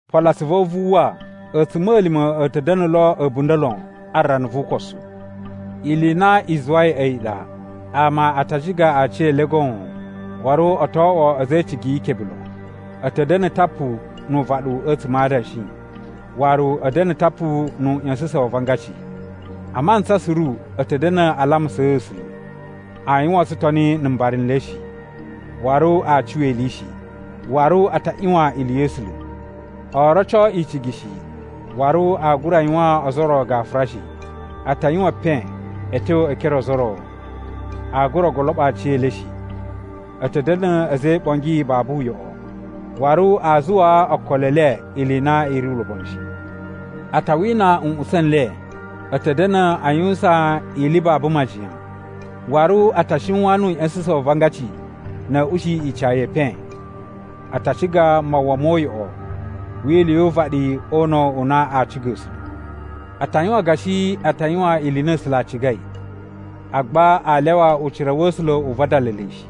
Polo atsuvu a̱ wu vu uwwa, a̱tsuma̱lima̱ a̱ ta̱ da̱na̱ lo a̱bunda̱ lon a rana vu ukosu. Ili i na i zuwai a̱yi ɗa, ama a ta a ciga aciyele goon, waru o to oꞌwo a̱za̱ e icigi ikebe lon. A̱ ta̱ da̱na̱ tapu nu uvaɗu a̱tsuma̱ a adanshi, waru a̱ da̱na̱ tapu nu uꞌya̱sa̱sa̱n wa avangaci. A mantsa suru a̱ ta̱ da̱na̱ a lamusaa A̱sula̱. Aa yuwan tsutoni na̱ mbara n le shi, waru aa cuwa ili shi. Waru a ta ꞌyuwan ili ya̱ A̱sula̱. Oo roco icigi shi, waru aa gura yuwaan o ozo o ro gafura shi. A ta yuwan epen a̱ tyo ekere o ozo o ro, aa gura goloɓo aciyele shi. A̱ ta̱ da̱na̱ a̱za̱ e iɓongi babu uyoꞌo, waru aa zuwa okolo e ili i na i ri ulobonu shi. A ta wina nꞌutsa̱ n le. A̱ ta̱ da̱na̱ a yuwusan ili babu majiyan, waru a ta shiwan nu uꞌya̱sa̱sa̱n wa avangaci na̱ a̱ ushiyi ica ye epen. A ta ciga mawwa mo uyoꞌo wi ili yu uvaɗi o una̱ u na aa ciga A̱sula̱. A ta yuwan gashi a ta yuwan ili i na A̱sula̱ a cigai, agba aa lyawa ucira wa̱ A̱sula̱ u vadala le shi.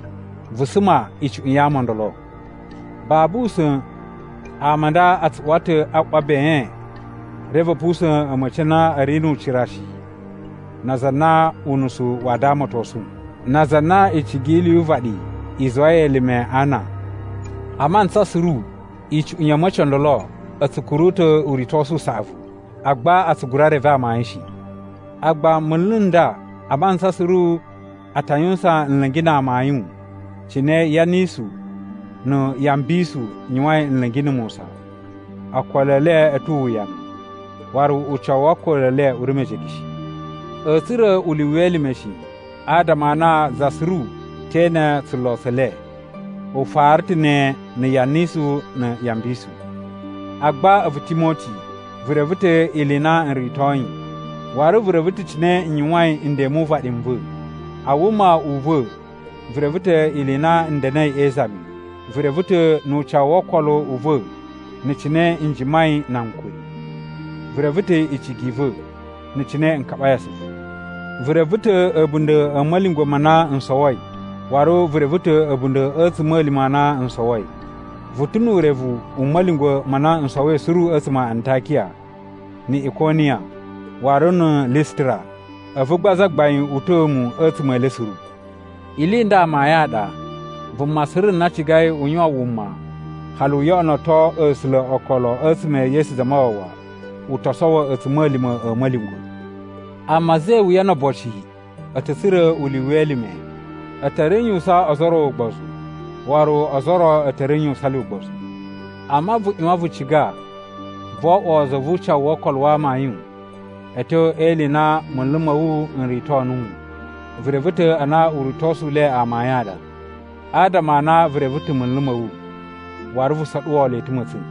Vu suma icuꞌun ya ama o ndolo. Babu usa̱n ama a nda a tsu uwa ta̱ a ꞌwa ben reve a̱ pusa̱n a̱ma̱ci a na a̱ ri nu ucira shi na aza a na unusu wa damatosun, na aza a na icigi yi ili yu uvaɗi i zuwai elime ana. A mantsa suru icuꞌun ya̱ a̱ma̱ci o ndolo a̱ tsu kuru ta̱ uritosu u saꞌavu, agba a tsu gura reve amayun shi. Agba munlu n nda a mantsa suru a ta yuwusan nla̱ngi na amayun cine Yanisu na̱ Yambinsu yuwain nla̱ngi na̱ Musa. Okolo e le a̱ tu uwuyanu, waru ucawu wo okolo e le u ri mejege shi. A̱a̱ tsura̱ ulyuwu we elime shi, adama a na za suru te ene tsulo tse le. U fara ta̱ ne na̱ Yanisu na̱ Yambinsu. Agba a̱vu Timoti, vu reve ta̱ ili i na n ritoi, waru vu reve ta̱ cine n yuwain nden mu uvaɗi n va̱. A wuma u va̱ vu reve ta̱ ili i na n da̱na̱i e izami. Vu reve ta̱ nu ucawu wo okolo u va̱ na̱ cine n jimai na ankuri. Vu reve ta̱ icigi i va̱ na̱ cine n kaɓai asuvu. Vu reve ta̱ a̱bunda̱ a̱ ma̱lyungwa̱ ma na n sowoi waru vu reve ta̱ a̱bunda̱ a̱ a̱tsuma̱lima̱ a na n sowoi. Vu ta̱ nu urevu u ma̱lyungwa̱ ma na n sowoi suru a̱tsuma̱ a Antakiya, ni Ikoniya, waru na̱ Lisitira, a̱vu gba Zagbain uta̱a̱ mu a̱tsuma̱ e le suru. Ili i nda amayun a ɗa: vuma suru na cigai u yuwan wuma hali u yoꞌonoto A̱sula̱ okolo a̱tsuma̱ e Yesu Zamawawa u to sowo a̱tsuma̱lima̱ a̱ ma̱lyungwa̱. Amma a̱za̱ e iwuya no oboci a̱ ta̱ tsura̱ ulyuwu we elime. A̱ ta̱ ri n yuwusan ozo o ro ugbozu, waru ozo o ro a̱ ta̱ ri n yuwusan le ugbozu. Amma vu ꞌyuwan vu ciga vo oꞌwo za vu ucawu wo okolo wa amayun a̱ tyo e ili i na munlu ma̱ wu n rito nuwu. Vu reve ta̱ a na uritosu u le amayun a ɗa, adama a na vu reve ta̱ munlu ma̱ wu waru vu soɗuwo le ta̱ ma̱tsa̱n.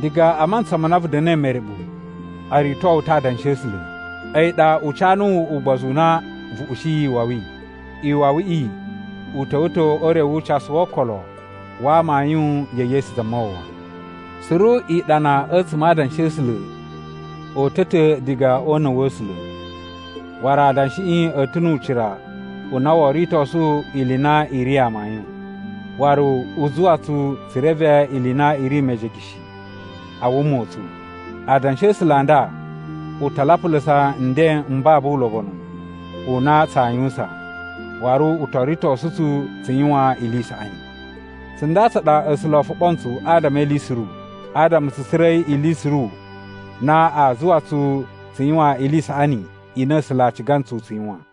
Diga a mantsa ma na vu da̱na̱i mereɓu o rito wu ta̱ Adanshi a̱ A̱sula̱. A̱yi ɗa u ca nuwu ugbozu u na vu ushiyi iwawi. Iwawiꞌi u ta̱wa̱ ta̱ o ure wu ucasu wo okolo wa amayun ya̱ Yesu Zamawawa. Suru iɗana a̱tsuma̱ a Adanshi a̱ A̱sula̱ o uta̱ ta̱ diga o una̱ wa̱ A̱sula̱, waru adanshiꞌi a̱ ta̱ nu ucira u na woo ritosu ili i na i ri amayun, waru u zuwa tsu tsu reve ili i na i ri mejege shi a wuma u tsu. Adanshi a̱ A̱sula̱ a nda u ta lapulusa nden m babu ulobonu u na tsaa yuwusan, waru u to ritosu tsu tsu yuwan ili i saꞌani. Tsunda tsa ɗa A̱sula̱ o foɓo ntsu adama e ili suru, adama tsu tsura̱i ili suru na aa zuwa tsu tsu yuwan ili i saꞌani i na A̱sula̱ a ciga ntsu tsu yuwan.